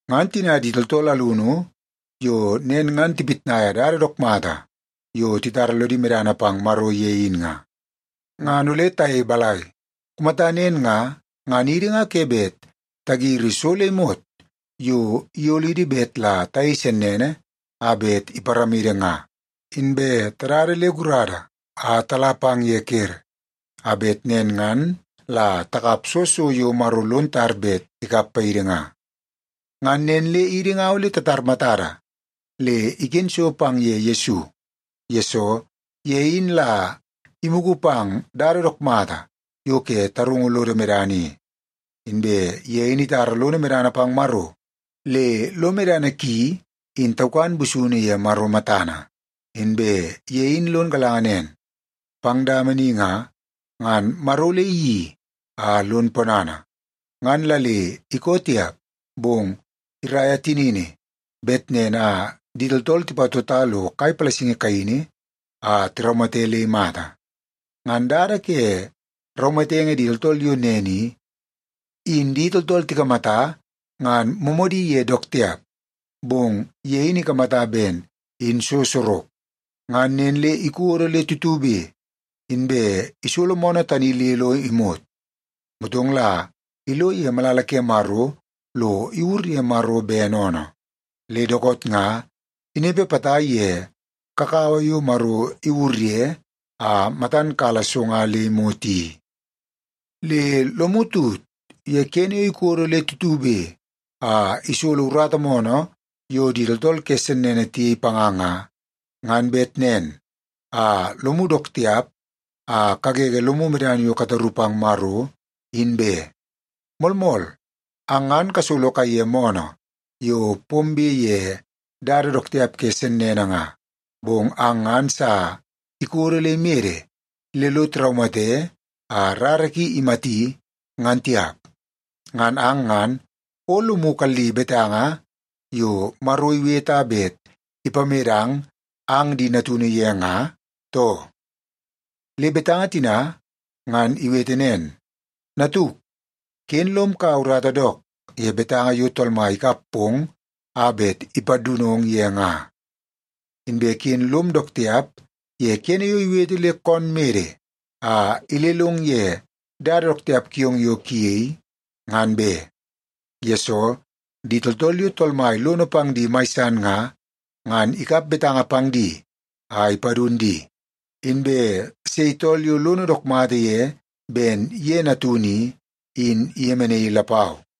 Ngan tina di tooltool alunu yo nen ngan tipitnai dada dook mata yo titara lodi medana pang Maro ye in nga, ngan ole tayei balai? Kumata nen nga, ngan idi nga ke bet tagiri so le imot yo iyolidi bet la tayei sennene a bet iparamidi nga, inbe tadada le gurada a tala pang ye ker, a bet nen ngan la takap soo so yo Maro lon tar bet ikap paidi nga. Ngan nen le idi nga ole tatar matada le iken so pang ye Yesu, yesoo ye in la imugu pang dada dook mata yo ke tarungu lodo medana i, inbe ye in itara lono medana pang Maro le lo medana ki in taukan busunu ye Maro matana. Inbe ye in lon galanga nen, pang dama ni nga, ngan Maro ole iyeii a lon ponana, ngan la le ikoo tiap, bong iraia tinini bet nen a di tooltool tipatota lo kai palasingi kaini a tiraumate le imata. Ngan dada ke raumatenge di tooltool yo nen i, in di tooltool tikamata ngan moomoodi ye dook tiap, bong ye in ikamata ben in so sorok, ngan nen le ikodo le tutube inbe isolo moonoo tani le lo imot. Motong la ilo ye malala ke Maro lo iwur ye Maro bene oonoo. Le dookoot nga, inepe potai ye kakawa yo Maro iwur ye a matan kala so nga le imot i. Le lomu tut ye kene yo ikodo le tutube a isolo urata moonoo yo di tooltool ke sennene tiyei panga nga, ngan bet nen a lomu dook tiap a kagege lomu medana yo kataru pang Maro, in be. Moolmool, ang ngan kasolo kaiye moonoo yo pombe ye dada dook tiap ke sennene nga, bong ang ngan sa ikodo le imede le lo tiraumate a rara ki imati, ngan tiap. Ngan ang ngan o lomu kalli betanga yo Maro iwete a bet ipamedang ang di natunu ye nga, too? Le betanga tina ngan iwete nen, “Natuk, ken lom kaua urata dook ye betanga yo Tool Mai ikap pong a bet ipadunong ye nga, inbe ken lom dook tiap ye kene yo iwete le koon mede a ilelong ye dada dook tiap kiong yo kuyei, ngan be. Yesoo, di tooltool yo Tool Mai lono pang di mai san nga, ngan ikap betanga pang di a ipadun di, inbe sei tool yo lono dook mata ye ben ye natunu i, in iyemenaii lapau.”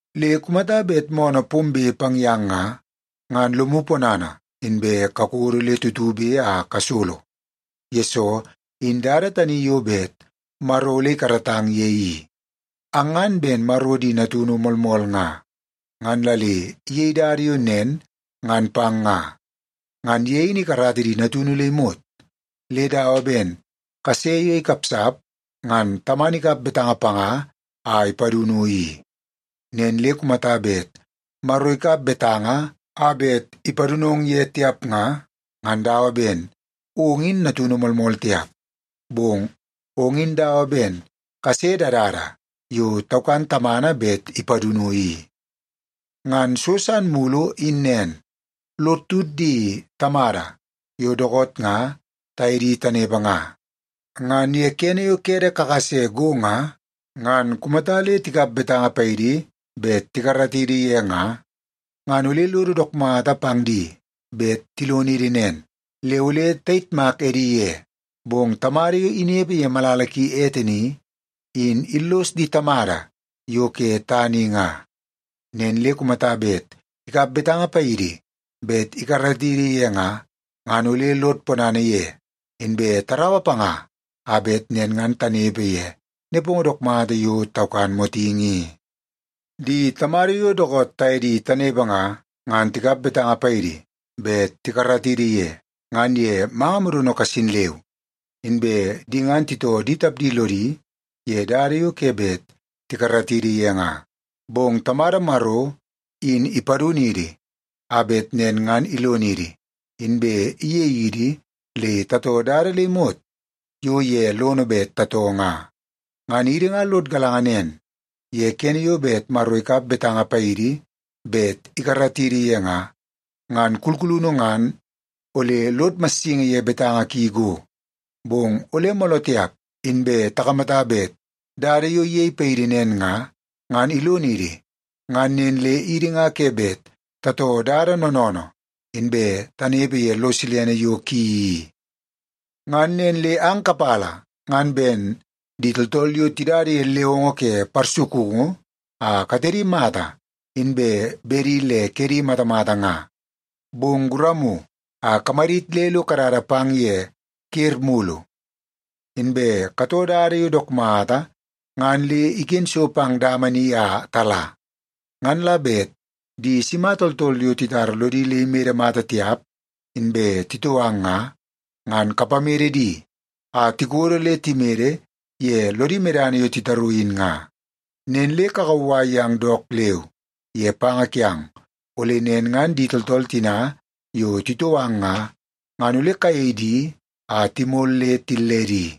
Le kumata bet moonoo pombe pang yang nga, ngan lomu ponana inbe kakodo le tutube a kasolo, yesoo in dada tani yo bet Maro ole ikaratang ye i. Ang ngan ben Maro di natunu moolmool nga, ngan la le iyei dada yo nen ngan pang nga. Ngan ye in ikarata di natunu le imot, le dawa ben kase yo ikapsap, ngan tamana ikap betanga panga a ipadunu i. Nen le kumata bet Maro ikap betanga a bet ipadunong ye tiap nga, ngan dawa ben ong in natunu moolmool tiap, bong ong in dawa ben kase dadada yo taukan tamana bet ipadunu i. Ngan so san mulu in nen. Lod tut di tamada yo dookoot nga taye di tanepe nga. Ngan ye kene yo kede kakase go nga, ngan kumata le tikap betanga paidi bet tikaratidi ye nga, ngan ole lodo dook mata pang di bet tilonidi nen, le ole tayitmak edi ye. Bong Tamada yo inepe ye malala ki ete ni, in illos di tamada yo ke tana i nga. Nen le kumata bet ikap betanga paidi bet tikaratidi ye nga, ngan ole lod ponana ye, inbe taraua panga a bet nen ngan tanepe ye nepongo dook mata yo taukan motingi i. Di tamada yo dookoot taye di tanepe nga, ngan tikap betanga paidi bet tikaratidi ye, ngan ye manga modono kasin leu. Inbe di ngan titoo di tapdi lodi ye dada yo ke bet tikaratidi ye nga. Bong Tamada Maro in ipadunidi, a bet nen ngan ilonidi, inbe iyei idi le tatoo dada le imot yo ye lono bet tatoo nga. Ngan idi nga lod galanga nen, ye kene yo bet Maro ikap betanga paidi bet ikaratidi ye nga, ngan kulkulunu ngan ole lod massingi ye betanga ki go. Bong ole mooloo tiap inbe takamata bet dada yo iyei paidi nen nga, ngan ilonidi ngan nen le idi nga ke bet tatoo dada noonoonoo, inbe tanepe ye lo silene yo ki i. Ngan nen le ang kapala ngan ben di tooltool yo tidada ye lewongo ke parsukungu a katedi mata inbe bedi le kedi matamata nga. Bong guramu a kamadit le lo kadada pang ye ker mulu. Inbe katoo dada yo dook mata ngan le iken so pang dama ni a tala. Ngan la bet di sima tooltool yo titara lodi le imede mata tiap, inbe titoo ang nga, ngan kapamede di a tikodo le timede ye lodi medana yo titaru in nga. Nen le kakauwai yang dook leu ye panga kiang, ole nen ngan di tooltool tina yo titoo ang nga, ngan ole kayei di a timol le tilledi.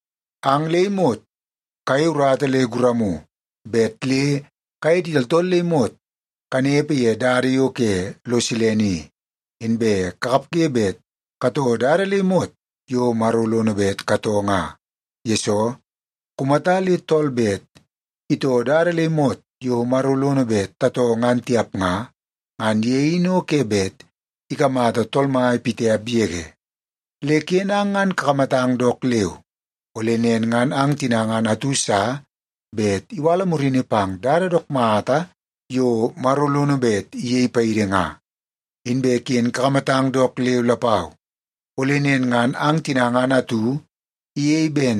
Ang le imot kayei urata le guramu bet le kaye di tooltool le imot kanepe ye dada yo ke lo silene i, inbe kakapge bet katoo dada le imot yo Maro lono bet katoo nga. Yesoo, kumata le tool bet itoo dada le imot yo Maro lono bet tatoo ngan tiap nga, ngan ye in o ke bet ikamata Tool Mai pitiap yege. Le ken ang ngan kakamatang dook leu, ole nen ngan ang tina ngan atu sa bet iwala murini pang dada dook mata yo Maro lono bet iyei paidi nga. Inbe ken kakamatang dook leu lapau, ole nen ngan ang tina ngan atu iyei ben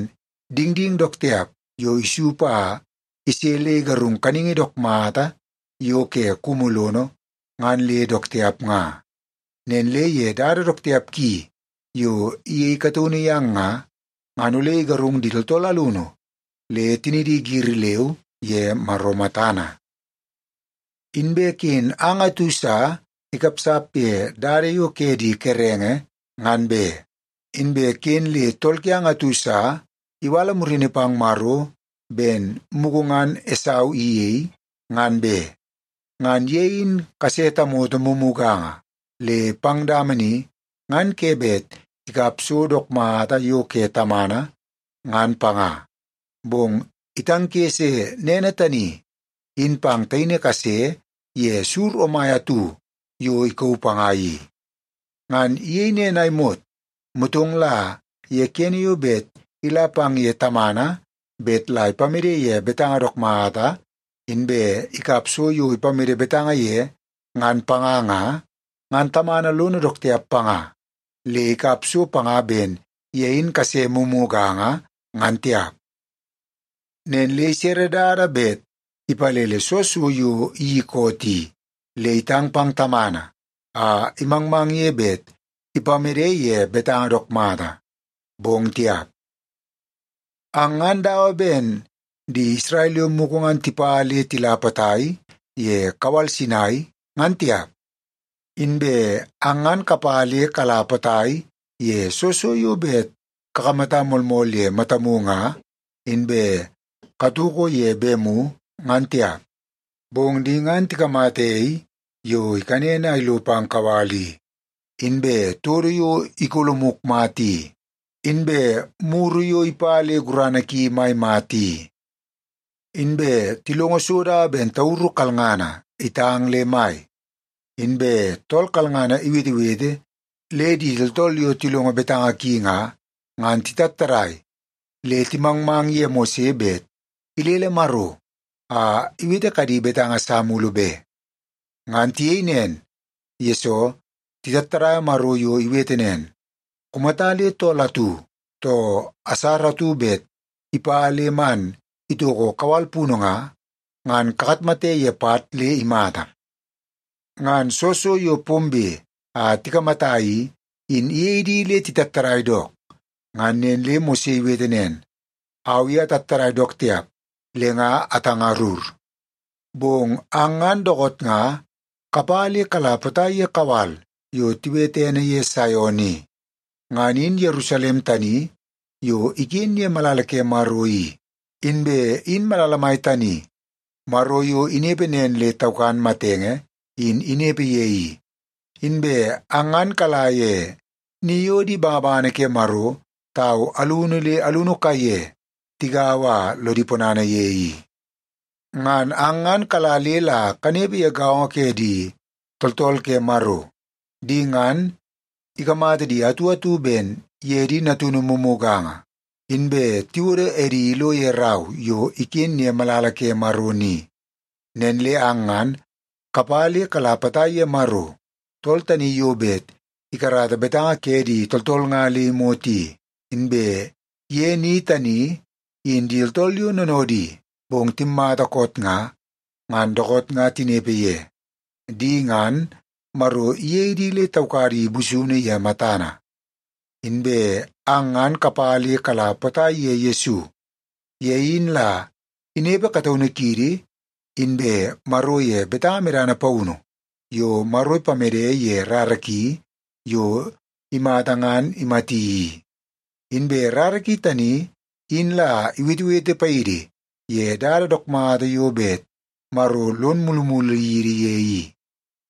dingding dook tiap yo isup a ise le igarung kaningi dook mata yo ke kumu lono ngan le dook tiap nga. Nen le ye dada dook tiap ki yo iyei kataunu yang nga, ngan ole igarung di tooltool alunu le tinidi giri leu ye Maro matana. Inbe ken ang atu sa ikapsap ye dada yo ke di kerenge, ngan be. Inbe ken le tool kiang atu sa iwala murini pang Maro ben mugu ngan Esau iyei, ngan be. Ngan ye in kase tamoto mumuganga le pang dama ni ngan ke bet ikap so dook mata yo ke tamana, ngan panga, bong itangkese nene tani in pang taini kase ye sur omai atu yo ikauu panga i. Ngan iyei nen a imot, motong la ye kene yo bet ila pang ye tamana bet la ipamede ye betanga dook mata, inbe ikap so yo ipamede betanga ye ngan panga nga, ngan tamana lono dook tiap panga, le ikap so panga ben ye in kase mumuganga, ngan tiap. Nen le isere dada bet ipalele soo so yo iyeii koot i, le itang pang tamana a imangmang ye bet ipamede ye betanga dook mata. Bong tiap! Ang ngan dawa ben di Isrel yo mugu ngan tipa le tila potai ye kawal Sinai, ngan tiap. Inbe ang ngan kapa le kala potai ye soo so yo bet kakamata moolmool ye matamu nga, inbe katoko ye bemu, ngan tiap. Bong di ngan tikamata ei yo ikanen a ilo pang kawal i, inbe todo yo ikolomuk mata i, inbe muru yo ipa le gurana ki mai mata i. Inbe tilongo so dawa ben tauru kalngana itang le mai, inbe tool kalngana iwetewete le di tooltool yo tilongo betanga ki nga, ngan titattadai le timangmang ye Mose bet ilele Maro a iwete kadi betanga sa mulu be. Ngan tiyei nen, yesoo titattadaia Maro yo iwete nen, “Kumata le tool atu, too asara atu bet ipa le man itoko kawal punu nga, ngan kakatmate ye pat le imata.” Ngan soo so yo pombe a tikamata i, in iyei di le titattadai dook. Ngan nen le Mose iwete nen, “Au i atattadai dook tiap le nga atangarur.” Bong ang ngan dookoot nga kapa le kala potai ye kawal yo tiwete ene ye Saion i. Ngan in Yerusalem tani yo iken ye malala ke Maro i, inbe in malala mai tani Maro yo inepe nen le taukan matenge, in inepe ye i. Inbe ang ngan kala ye ni yo di bangabangana ke Maro tau alunu le alunu kaiye tigaua a lodi ponana ye i. Ngan ang ngan kala le la kanepe ye gaongo ke di tooltool ke Maro. Di ngan, ikamata di atu atu ben ye di natunu mumuganga, inbe tiwodo edi ilo ye rau yo iken ye malala ke Maro ni. Nen le ang ngan kapa le kala potai ye Maro tool tani yo bet ikarata betanga ke di tooltool nga le imot i. Inbe ye ni tani, in di tooltool yo noonoodi bong timmata koot nga, ngan dookoot nga tinepe ye. Di ngan, Maro iyei di le taukadi busunu ye matana. Inbe ang ngan kapa le kala potai ye Yesu. Ye in la inepe kataunu kiidi inbe Maro ye betanga medana paunu yo Maro ipamede ye rara ki yo imata ngan imati i. Inbe rara ki tani in la iwetewete paidi ye dada dook mata yo bet Maro lon mulumulu yidi ye i,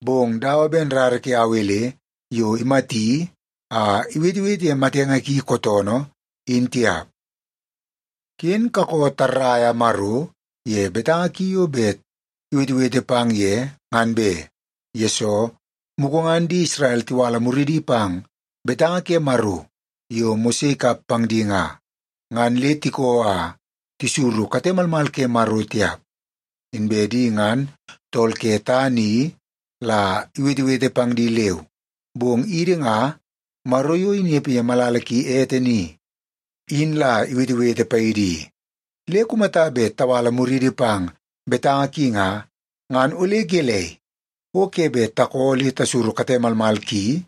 bong dawa ben rara ke Awel yo imati a iwetewete ye matenge ki kootoonoo, in tiap. Ken kakoo tarraia Maro ye betanga ki yo bet iwetewete pang ye, ngan be. Yesoo, mugu ngan di Isrel tiwala muridi pang betanga ke Maro yo Mose ikap pang di nga, ngan le tikoo a tisuru kate malmal ke Maro tiap. Inbe di ngan tool ke tana i la iwetewete pang di leu, bong idi nga, Maro yo inepe ye malala ki ete ni, in la iwetewete paidi i. Le kumata bet tawala muriidi pang betanga ki nga, ngan ole gelei, o ke bet takoo le tasuru kate malmal ki,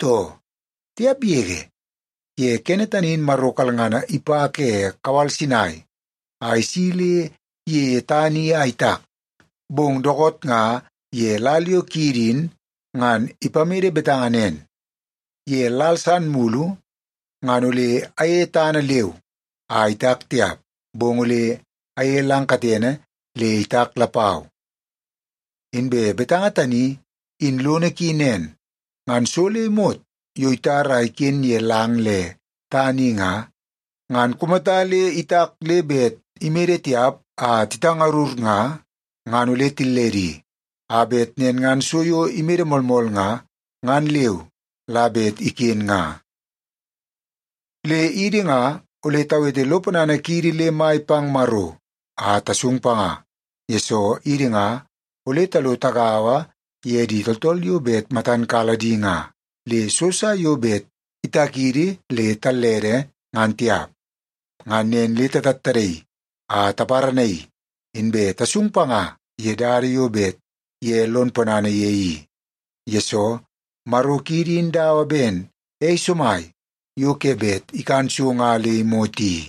too? Tiap yege! Ye kene tani in Maro kalngana ipa ke kawal Sinai a isi le iyeie tana i a itak. Bong dookoot nga ye lal yo kiidi in ngan ipamede betanga nen, “Ye lal san mulu, ngan ole ayeie tana leu a itak tiap, bong ole ayeie lang katene le itak lapau.” Inbe betanga tani, in lono ki nen. Ngan so le imot yo itar a iken ye lang le tana i nga, ngan kumata le itak le bet imede tiap a titangarur nga, ngan ole tilledi, a bet nen ngan so yo imede moolmool nga, ngan leu la bet iken nga. Le idi nga ole tawete lo ponana kiidi le mai pang Maro a tasung panga, yesoo idi nga ole talo tagaua ye di tooltool yo bet matan kala di nga, le so sa yo bet itakidi le tallede, ngan tiap. Ngan nen le tatattadaii a taparanaii, inbe tasung panga ye dada yo bet ye lo ponana ye i. Yesoo, Maro kiidi in dawa ben ei somai yo ke bet ikan so nga le imot i.